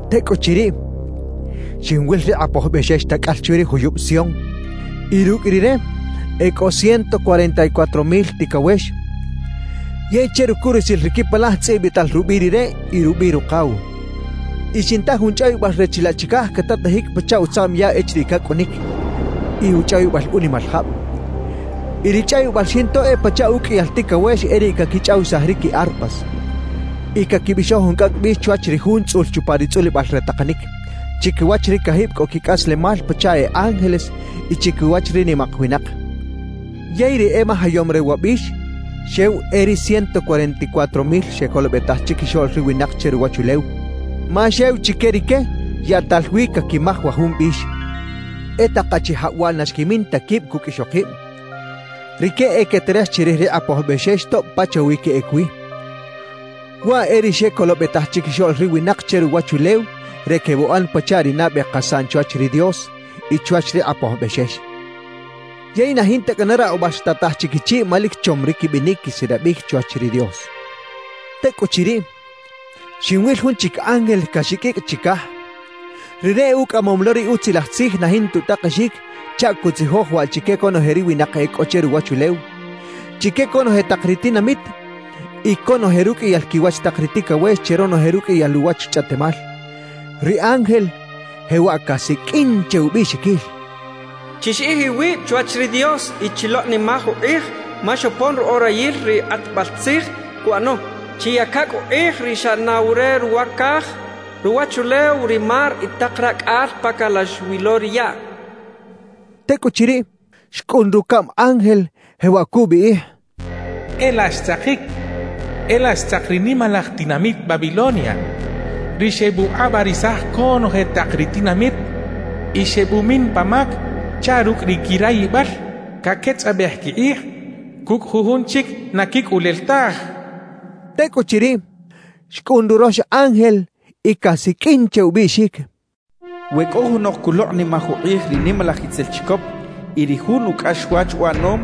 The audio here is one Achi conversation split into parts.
Tekꞌuchiriꞌ, xinwil ri Qꞌapoj Bꞌexex takꞌal chwi ri juyubꞌ Sion y rukꞌ Rire e kꞌo ciento cuarenta y cuatro mil tikawex, yey che rukurusil ri kipalaj tzꞌibꞌital rubꞌiꞌ Rire y rubꞌiꞌ Ruqaw. Y xinta jun chꞌawibꞌal re chilaꞌ chikaj katatajik pachaꞌ utzaꞌm yaꞌ echiriꞌ kakꞌunik y uchꞌawibꞌal unimal jabꞌ; y ri chꞌawibꞌal xinto e pachaꞌ ukꞌiyal tikawex e riꞌ kakichꞌawisaj ri ki arpas. Y kakibꞌixoj jun kꞌakꞌ bꞌix chwach ri Jun tzꞌul chupa ri tzꞌulibꞌal re taqanik, chikiwach ri kajibꞌ kꞌo kikꞌaslemal pachaꞌ e ángeles y chikiwach ri nimaq winaq. Yey ri emajayom re wa bꞌix xew e ri ciento cuarenta y cuatro mil xekolobꞌetaj chikixoꞌl ri winaq che ruwachulew, ma xew chike rike yaꞌtal wi kakimaj wa jun bꞌix. E taq achijabꞌ waꞌ na xkimin ta kibꞌ kukꞌ ixoqibꞌ. Rike e keterej chirij ri Qꞌapoj Bꞌexex tobꞌ pachawi keꞌek wi. Waꞌ e ri xekolobꞌetaj chikixoꞌl ri winaq che ruwachulew re kebꞌuꞌan pachaꞌ ri nabꞌe qasaꞌn chwach ri Dios y chwach ri Qꞌapoj Bꞌexex. Yey na jinta kꞌana raqꞌubꞌal xtataj chikichiꞌ ma lik chom ri kibꞌinik kisilabꞌik chwach ri Dios. Tekꞌuchiriꞌ, xinwil jun chik ángel kaxikꞌikꞌ chikaj. Rire ukꞌamom lo ri Utzilaj Tzij na jinta utaqexik chaꞌ kutzijoj waꞌ chike konoje ri winaq e kꞌo che ruwachulew, chike konoje taq ri tinamit y konoje rukꞌiyal kiwach taq ri tikawex che ronoje rukꞌiyal uwach chꞌaꞌtemal. Ri ángel jewaꞌ kasikꞌin che ubꞌiꞌxikil: «Chixiꞌij iwibꞌ chwach ri Dios y chiloqꞌnimaj uqꞌij ma xopon ru orayil ri qꞌatbꞌal tzij kuꞌano; chiyaka kꞌu uqꞌij ri xꞌanaw re ruwa kaj, ruwachulew, ri mar y taq rakꞌal pa kalax wi lo ri yaꞌ» kachaꞌ. Tekꞌuchiriꞌ, xkꞌun rukaꞌm ángel jewaꞌ kubꞌiꞌij: «¡E laꞌ xtzaqik! E laꞌ xtzaq ri nimalaj tinamit Babilonia, ri xebꞌuqꞌabꞌarisaj konoje taq ri tinamit y xebꞌumin pa mak chaꞌ rukꞌ ri kirayibꞌal kaketzꞌabꞌej kiqꞌij kukꞌ jujun chik na kikꞌulel taj» kachaꞌ. Tekꞌuchiriꞌ, xkꞌun rurox ángel y kasikꞌin che ubꞌiꞌxik: «We kꞌo junoq kuloqꞌnimaj uqꞌij ri nimalaj itzel chikop y ri jun ukꞌaxwach uꞌanom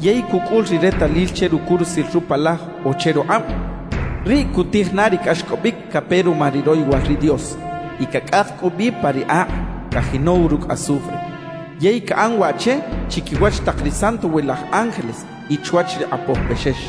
yey kukꞌul ri retalil che rukurusil rupalaj o che ruqꞌabꞌ, riꞌ kutij na ri kꞌaxkꞌobꞌik kape ruma ri royowal ri Dios; y kakꞌaq kꞌu bꞌi pa ri aqꞌ kajinow rukꞌ azufre. Yey kaꞌan waꞌ che chikiwach taq ri santowilaj ángeles y chwach ri Qꞌapoj Bꞌexex.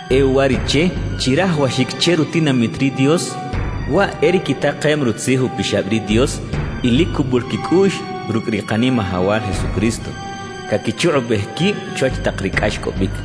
E uwariꞌche chirajawaxik che rutinamit ri Dios, waꞌ e ri kitaqem Rutzij Upixabꞌ ri Dios y lik kubꞌul kikꞌuꞌx rukꞌ ri Qanimajawal Jesucristo, kakichuqꞌubꞌej kibꞌ chwach taq ri kꞌaxkꞌobꞌik.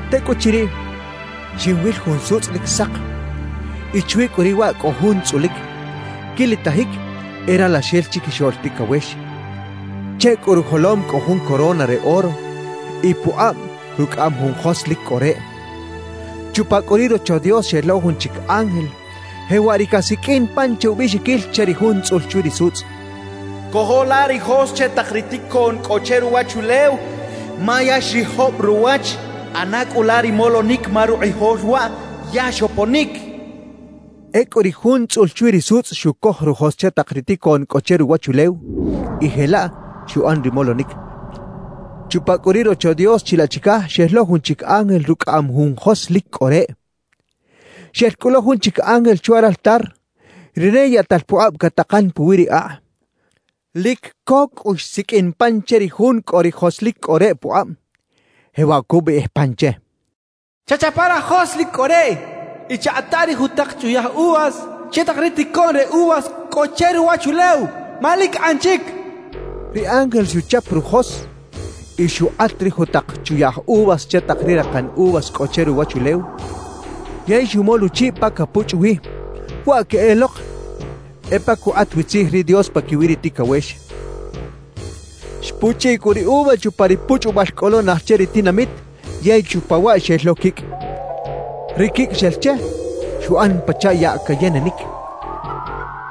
Tekꞌuchiriꞌ, xinwil jun sutzꞌ lik saq y chwi kꞌu riꞌ waꞌ kꞌo Jun tzꞌulik, kilitajik e Ralaxel Chikixoꞌl Tikawex. Che kꞌu rujolom kꞌo jun corona re oro y puqꞌabꞌ rukꞌaꞌam jun jos lik kꞌo reꞌ. Chupa kꞌu ri Rocho Dios xel lo jun chik ángel, jewaꞌ ri kasikꞌin pan che ubꞌiꞌxikil che ri Jun tzꞌul chwi ri sutzꞌ: «Kojo la ri jos che taq ri tikoꞌn kꞌo che ruwachulew ma ya xriꞌjobꞌ ruwach; ꞌana kꞌu la ri molonik ma ruqꞌijol waꞌ ya xoponik» kachaꞌ. Ekꞌu ri Jun tzꞌul chwi ri sutzꞌ xukoj rujos che taq ri tikoꞌn kꞌo che ruwachulew y jelaꞌ xuꞌan ri molonik. Chupa kꞌu ri Rocho Dios chilaꞌ chikaj xel lo jun chik ángel rukꞌaꞌam jun jos lik kꞌo reꞌ. Xel kꞌu lo jun chik ángel chwa raltar; rire yaꞌtal puqꞌabꞌ kataqan puwi ri aqꞌ. Lik ko kꞌu xsikꞌin pan che ri jun kꞌo ri jos lik kꞌo reꞌ puqꞌabꞌ, jewaꞌ kubꞌiꞌij pan che: «Chachapa rajos lik kꞌo reꞌ y chaqꞌata ri jutaq chuyaꞌj uvas che taq ri tikoꞌn re uvas kꞌo che ruwachulew, ma lik qꞌan chik» kachaꞌ. Ri ángel xuchap rujos y xuqꞌat ri jutaq chuyaꞌj uvas che taq ri raqan uvas kꞌo che ruwachulew yey xumol uchiꞌ pa kapuchꞌ wi; waꞌ keꞌeloq e pa kuqꞌat wi tzij ri Dios pakiwi ri tikawex. Xpuchꞌiꞌ kꞌu ri uva chupa ri puchꞌubꞌal kꞌo lo naj che ri tinamit yey chupa waꞌ xel lo kikꞌ. Ri kikꞌ xel che, xuꞌan pachaꞌ yaꞌ kayenenik.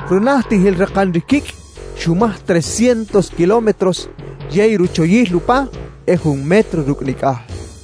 Runajtijil raqan ri kikꞌ xumaj trescientos kilómetros yey ruchoyil upa e jun metro rukꞌ nikꞌaj.